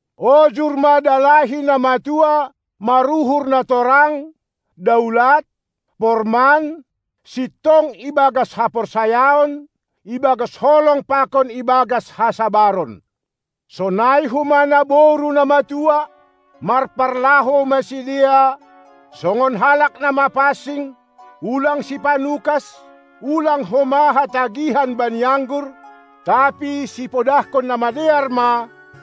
Ojur ma dalahi na matua maruhur na torang, daulat, porman, sintong ibagas haporsayaon, ibagas holong pakon ibagas hasabaron. Sonai homa naboru na matua, marparlahou ma sidea songon halak na mapansing, ulang sipanukas, ulang homa hatagihan bani anggur, tapi sipodahkon na madear ma,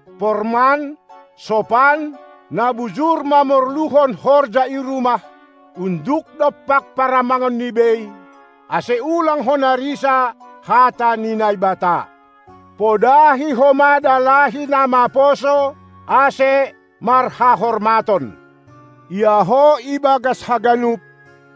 porman, sopan, na bujur mamorluhon horja i rumah, unduk dompak paramangonni bei, ase ulang hona risa hata ni Naibata. Podahi homa dalahi na maposo, ase marhahormaton. Ia ho, ibagas haganup,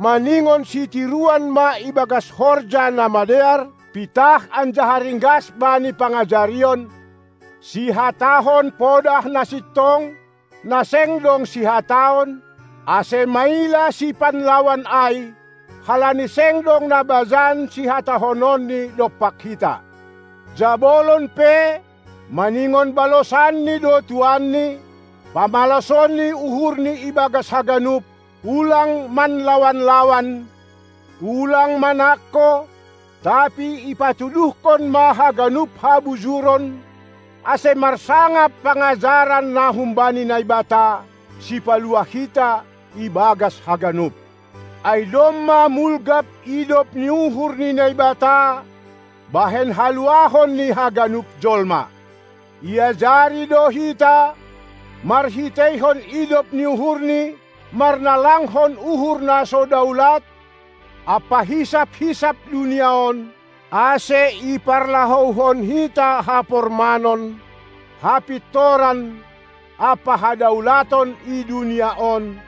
maningon sitiruan ma ibagas horja namadear, pitah anjaha ringgas bani pangajarion; sihatahon podah na sintong, na seng dong sihataon, ase maila sipanlawan ai, halani seng dong na bajan sihatahononni dompak hita. Jabolon pe maningon balosanni do tuanni, pamalasonni uhurni ibagas haganup, ulang manlawan-lawan, ulang manangko, tapi ipatuduhkon ma haganup habujuron, ase marsangap pangajaran na humbani Naibata, Sipaluah hita, ibagas haganup. Ai domma mulgap idop ni uhur ni Naibata bahen haluahon ni haganup jolma. Iajari do hita marhiteihon idop ni uhurNi marnalangkon uhur na so daulat ampa hisap-hisap dunia on, ase iparlahouhon hita hapormanon, hapintoran, ampa hadaulaton i dunia on,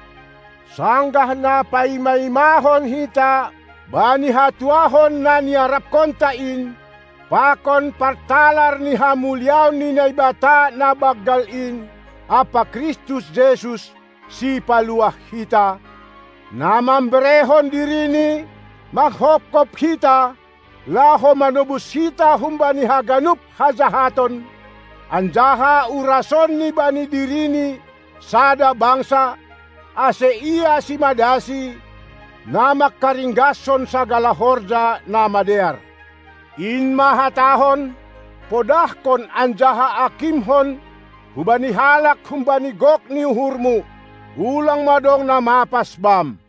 sanggah na paima-imahon hita bani hatuahon na niaraphonta in pakon partalar ni hamuliaon ni Naibata na banggal in ampa Kristus Jesus, Sipaluah hita, na mamberehon diriNi manghophop hita, laho manobus hita humbani haganup hajahaton, anjaha urasonNi bani diriNi sada bangsa, ase Ia simadaSi, na mangkaringgashon sagala horja namadear. In ma hatahon, podahkon anjaha akimhon hubani halak humbani gok ni uhurmu. Ulang ma dong na mapas bam.